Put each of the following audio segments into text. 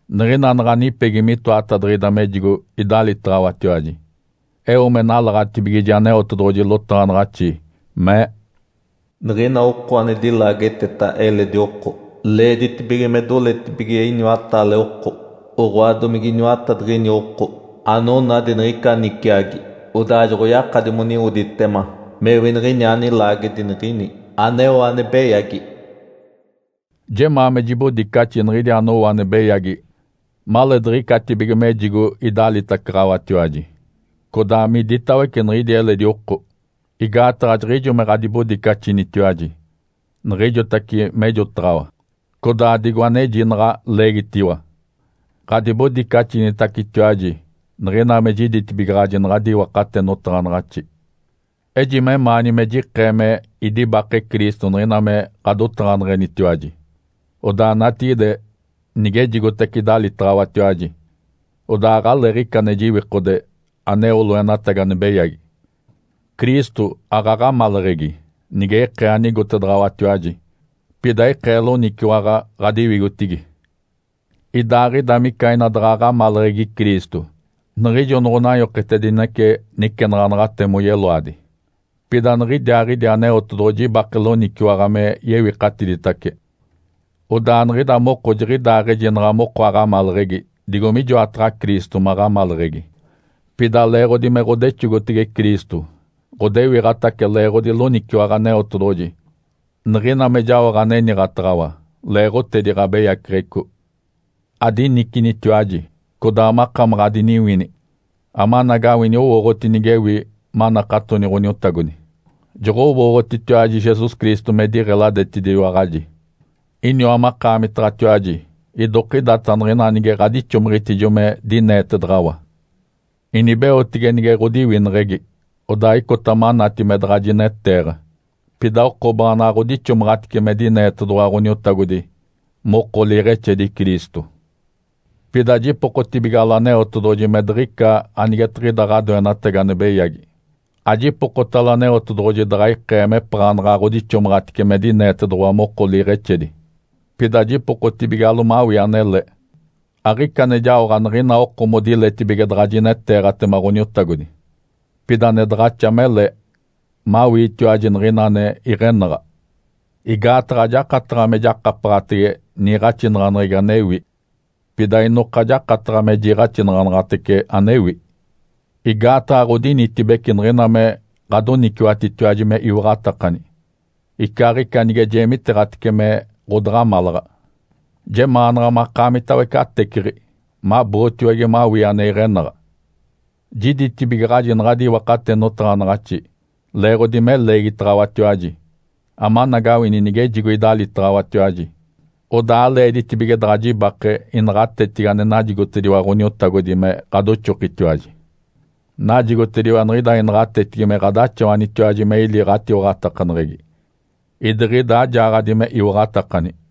Niɡ̶ina naɡ̶a nipegi mitoatadiɡ̶ida mejigo idalitaɡ̶awatiwaji. Eo me nalaɡ̶atibigiji Aneotedoɡ̶oji lotaɡ̶anaɡ̶axi mee, “Niɡ̶ina oko ane dilaageteta eledi oko, leeditibige me doletibige iniwataale oko, oɡ̶oa domige iniwatadiɡ̶ini oko anonadi niɡ̶ica niciagi, odaa joɡ̶oyakadi moniwoditema mewi niɡ̶iniaa nilaagedi niɡ̶ini aneo ane beyagi.” Jemaa me jibodicaxi niɡ̶idi anowo ane beyagi maleediɡ̶icatibige mejigo idalitacaɡ̶awatiwaji, codaa miditawece niɡ̶idi eledi oko. Igaataɡ̶a jiɡ̶ijo me ɡ̶adibodicaxinitiwaji niɡ̶ijotace mejotaɡ̶awa, codaa digo aneji naɡ̶a leegitiwa, ɡ̶adibodicaxinitacetiwaji niɡ̶ina me jiditibigaɡ̶aji naɡ̶adi iwakate notaɡ̶anaɡ̶axi. Eji memaani me jikee me idibake Cristo niɡ̶ina me ɡ̶adotaɡ̶aneɡ̶enitiwaji. Odaa natigide nigejigotace idalitaɡ̶awatiwaji, odaa aɡ̶aleeɡ̶ica ane jiwikode aneo loenatagi ane beyagi. Cristo aɡ̶aɡ̶amaleɡ̶egi nige ikee anigotedaɡ̶awatiwaji, pida ikee loniciwaɡ̶a ɡ̶adiwigotigi. Idaaɡ̶ida mica ina daɡ̶a aɡ̶amaleɡ̶egi Cristo niɡ̶ijo noɡ̶onanyoketedinece nicenaɡ̶anaɡ̶ate moyeloadi. Pida niɡ̶idiaaɡ̶idi Aneotedoɡ̶oji ibake loniciwaɡ̶a me yewikatiditace. Odaa niɡ̶ida moko jiɡ̶idaɡ̶aɡ̶ejinaɡ̶a moko aɡ̶amaleɡ̶egi digo mijoataɡ̶a Cristo maɡ̶amaleɡ̶egi. Pida leeɡ̶odi me ɡ̶odexogotege Cristo, ɡ̶odewiɡ̶atace leeɡ̶odi loniciwaɡ̶a Aneotedoɡ̶oji niɡ̶ina me jaoɡ̶a aniniɡ̶ataɡ̶awa, leeɡ̶otedi ɡ̶abeyaceɡ̶eco. Adinicinitiwaji, codaa makamaɡ̶a adiniwini, amanagawini owooɡ̶oti nigewi manakatoni Ǥoniotagodi. Joɡ̶owooɡ̶otitiwaji Jesus Cristo me diɡ̶eladetediwaɡ̶aji. Iniwa makaamitatiwaji idokidata niɡ̶ina nige ɡ̶adixomiɡ̶itijo me dineetedaɡ̶awa. Inibeotege nige ɡ̶odiwineɡ̶egi, odaa icota manati me daɡ̶a jineteeɡ̶a, pida oko baanaɡ̶a ɡ̶odixomaɡ̶atice me dineetedoɡ̶owa Ǥoniotagodi moko liiɡ̶exedi Cristo. Pida jipokotibigalo Aneotedoɡ̶oji me diɡ̶ica anigetiɡ̶ida ɡ̶adoenatagi ane beyagi. Ajipokotalo Aneotedoɡ̶oji daɡ̶a ikee mepaɡ̶anaɡ̶a ɡ̶odixomaɡ̶atice me dineetedoɡ̶owa moko liiɡ̶exedi, pida jipokotibigalo mawii anele. Aɡ̶ica ane jaoɡ̶a nigina oko modiletibige daɡ̶a jineteeɡ̶atema Ǥoniotagodi. Pida ane daɡ̶axa mele mawiitiwaji niɡ̶ina ane iɡ̶enaɡ̶a. Igaataɡ̶a ajakataɡ̶a me jakapaɡ̶atege niiɡ̶axinaɡ̶aneɡ̶egi anewi, pida inoka jakataɡ̶a me jiiɡ̶axinaɡ̶anaɡ̶atece anewi. Igaataɡ̶a ɡ̶odinitibece niɡ̶ina me ɡ̶adoniciwatitiwaji me iwaɡ̶atakani, icaaɡ̶ica nige jeemiteeɡ̶atece me ɡ̶odaɡ̶amalaɡ̶a. Jemaanaɡ̶a makaamitawece ateciɡ̶i, mabootiwage mawii ane iɡ̶enaɡ̶a. Jiditibigaɡ̶aji naɡ̶adi iwakate notaɡ̶anaɡ̶axi leeɡ̶odi me leegitaɡ̶awatiwaji, amanagawini nigejigo idalitaɡ̶awatiwaji, odaa aleeditibige daɡ̶a jibake inaɡ̶atetigi ane najigotediwa Ǥoniotagodi me ɡ̶adoxokitiwaji. Najigotediwa niɡ̶ida inaɡ̶atetigi me ɡ̶adaxawanitiwaji me ili ɡ̶atiwaɡ̶atakaneɡ̶egi, idiɡ̶ida ajaaɡ̶adi me iwaɡ̶atakani.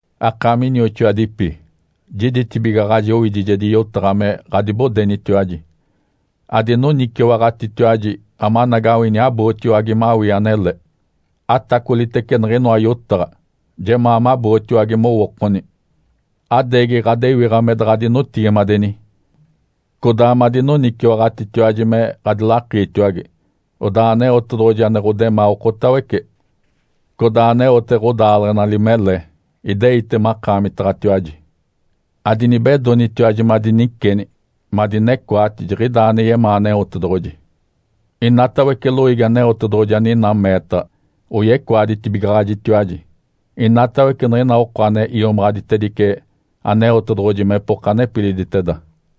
Akaami inioxoadipi. Jiditibigaɡ̶aji owidijedi yotaɡ̶a me ɡ̶adibodenitiwaji. Adinoniciwaɡ̶atitiwaji amanagawini abootiwage mawii anele! Atacolitece niɡ̶inoa yotaɡ̶a! Jemaa mabootiwage mowookoni! Adeegi ɡ̶adewiɡ̶a me daɡ̶adinotigimadeni, codaa madinoniciwaɡ̶atitiwaji me ɡ̶adilakiitiwage. Odaa Aneotedoɡ̶oji ane ɡ̶odemaa okotawece, codaa aneote ɡ̶odaaleɡ̶enali mele, ideite makaamitaɡ̶atiwaji. Adinibedonitiwaji madiniceni madinecoati jiɡ̶idaa ane yemaa Aneotedoɡ̶oji. Inatawece loiigi Aneotedoɡ̶oji aninaa meetaɡ̶a oyecoaditibigaɡ̶ajitiwaji, inatawece niɡ̶ina oko ane iomaɡ̶aditedice Aneotedoɡ̶oji mepoka nepiliditeda.